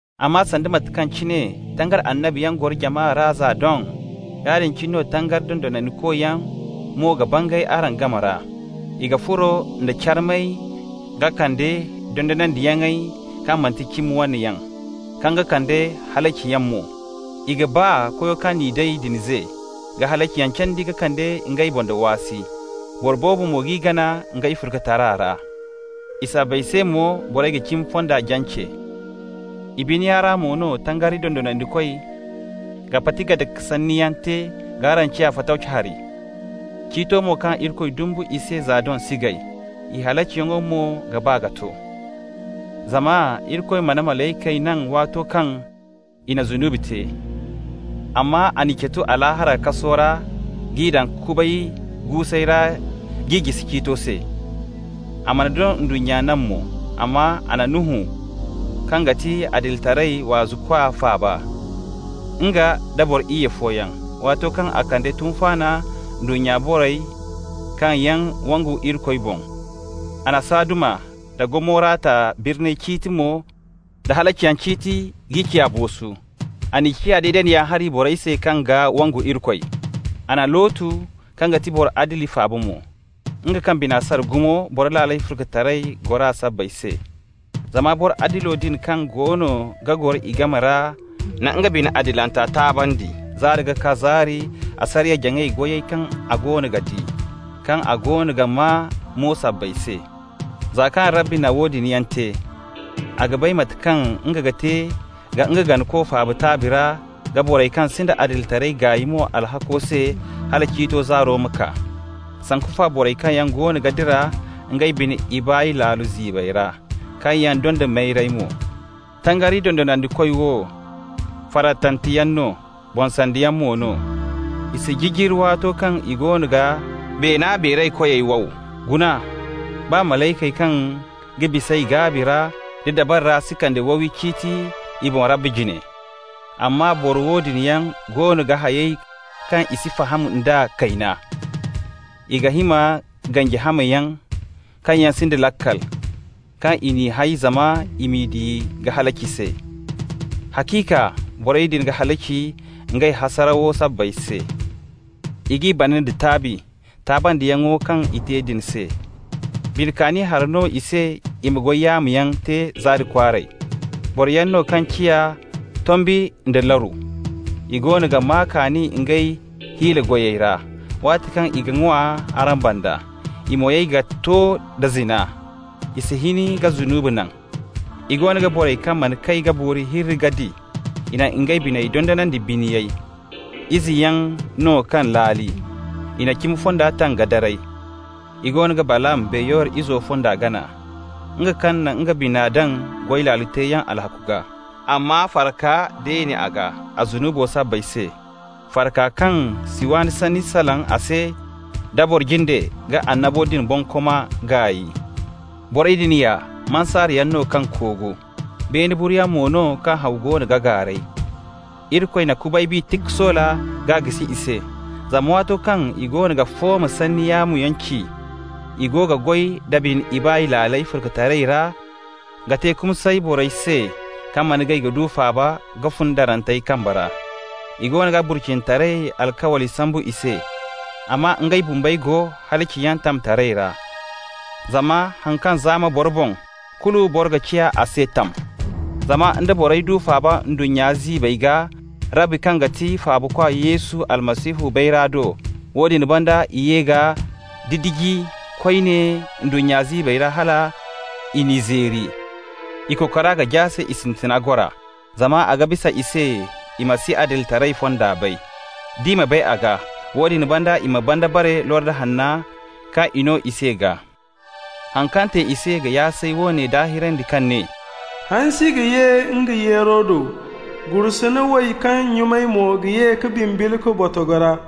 Amma sanda mate kaŋ cine tangari annabiyaŋ goro jama ra za doŋ, yaadin cine no tangari dondonandikoyaŋ mo ga bangay araŋ game ra. I ga furo nda carmay ka kande dondonandiyaŋey kaŋ manti cimi wane yaŋ, kaŋ ga kande halaciyaŋ mo. I ga baa Koyo kaŋ n'i day din ze, ka halaciyaŋ candi ka kande ngey boŋ da waasi. Boro boobo mo g'i gana ngey furkutara ra. I sabbay se mo borey ga cimi fonda jance. I biniya ra mo no tangari dondonandikoy ga pati-ka-dake sanniyaŋ te k'araŋ ciya fatawci hari. Ciito mo kaŋ Irikoy dumbu i se za doŋ si gay, i halaciyaŋo mo ga ba ka to. Zama Irikoy mana malaykey naŋ waato kaŋ i na zunubi te, amma a n'i catu Alaahara kaso ra k'i daŋ kubay guusey ra k'i jisi ciito se. A mana doŋ ndunnya naŋ mo, amma a na Nuhu, kaŋ ga ti adilitaray waazukwa faaba, nga nda boro iyye fooyaŋ, waato kaŋ a kande tunfaana ndunnya borey kaŋ yaŋ wangu Irikoy boŋ. A na Saduma nda Gomorata birney ciiti mo da halaciyaŋ ciiti k'i ciya boosu. A n'i ciya deedandiyaŋ hari borey se kaŋ ga wangu Irikoy. A na Lotu kaŋ ti boro adili faaba mo, nga kaŋ bina sara gumo boro laaley furkutaray gora sabbay se. (Zama boro adilo din kaŋ goono ga goro i game ra na nga bine adilanta taabandi zaari ka kaa zaari asariya-jaŋay goyey kaŋ a goono ga di, kaŋ a goono ga maa mo sabbay se.) Za kaŋ Rabbi na woodin yaŋ te, a ga bay mate kaŋ nga ga te ka nga ganakoy faaba taabi ra ka borey kaŋ sinda adilitaray gaay mo alhakku se hala ciiti zaaro ma kaa, sanku fa borey kaŋ yaŋ goono ga dira ngey bine ibaay laalo ziibey ra, kaŋ yaŋ ga donda mayray mo. Tangari dondonandikoy wo, farratanteyaŋ no, boŋ sando yaŋ mo no. I si jijiri waato kaŋ i goono ga beena beeraykoyey wow. Guna, baa malaykey kaŋ ga bis'ey gaabi ra da dabari ra si kande wowi ciiti i boŋ Rabbi jine. Amma boro woodin yaŋ goono ga hayey kaŋ i si faham nd'a kayna. I ga hima ganji hamyaŋ kaŋ yaŋ sinda laakal, kaŋ i n'i hay zama i m'i di ka halaci se. Haciika borey din ga halaci ngey hasarawo sabbay se. I g'i bana nda taabi, taabandiyaŋo kaŋ i te din se. Bine kaani hari no i se i ma goy yaamoyaŋ te zaari kwaaray. Boroyaŋ no kaŋ ciya tombi nda laru. I goono ga maa kaani ngey hiila goyey ra, waati kaŋ i ga ŋwa araŋ banda. I moy ga to da zina, i si hin ka zunubi naŋ, i goono ga borey kaŋ mana kay ka boori hirri ka di. I na ngey biney dondonandi biniyay, izeyaŋ no kaŋ laali. I na cimi fonda taŋ ka daray. I goono ga Balaam Beyor izo fonda gana, nga kaŋ na nga bina daŋ goy laalo teeyaŋ alhakku gaa. Amma farka deeni a gaa a zunubo sabbay se. Farka kaŋ si waani sanni salaŋ a se da boro jinde ka annabo din bonkoma gaay. Borey din ya mansaarayaŋ no kaŋ koogu, beene buruyaŋ mo no kaŋ haw goono ga gaaray. Irikoy na kubay bi tik soola ka jisi i se. Zama waato kaŋ i goono ga fooma sanni yaamoyaŋ ci, i ga goy da bine ibaay laaley furkutaray ra ka te kumsay borey se kaŋ mana gay ka du faaba ka fun darantey kambe ra. I goono ga burcinitaray alkawli sambu i se, amma ngey bumbey go halaciyaŋ tamtaray ra. Zama haŋ kaŋ zaama boro boŋ, kulu boro ga ciya a se tam. Zama nda borey du faaba ndunnya ziibey gaa Rabbi kaŋ ti Faabakwa Yesu Almasihu bayra do, woodin banda i ye ka didiji koyne ndunnya ziibey ra hal i n'i zeeri, i kokora ga jaase i sintina gora. Zama a ga bisa i se i ma si adilitaray fonda bay, d'i ma bay a gaa, woodin banda i ma banda bare lordi hanna kaŋ i no i se gaa. Haŋ kaŋ te i se ga yaasay woone daahirandi kaŋ ne: «Hansi ga ye nga yeero do, gursuna way kaŋ nyumay mo ga ye ka bimbilko botogo ra.»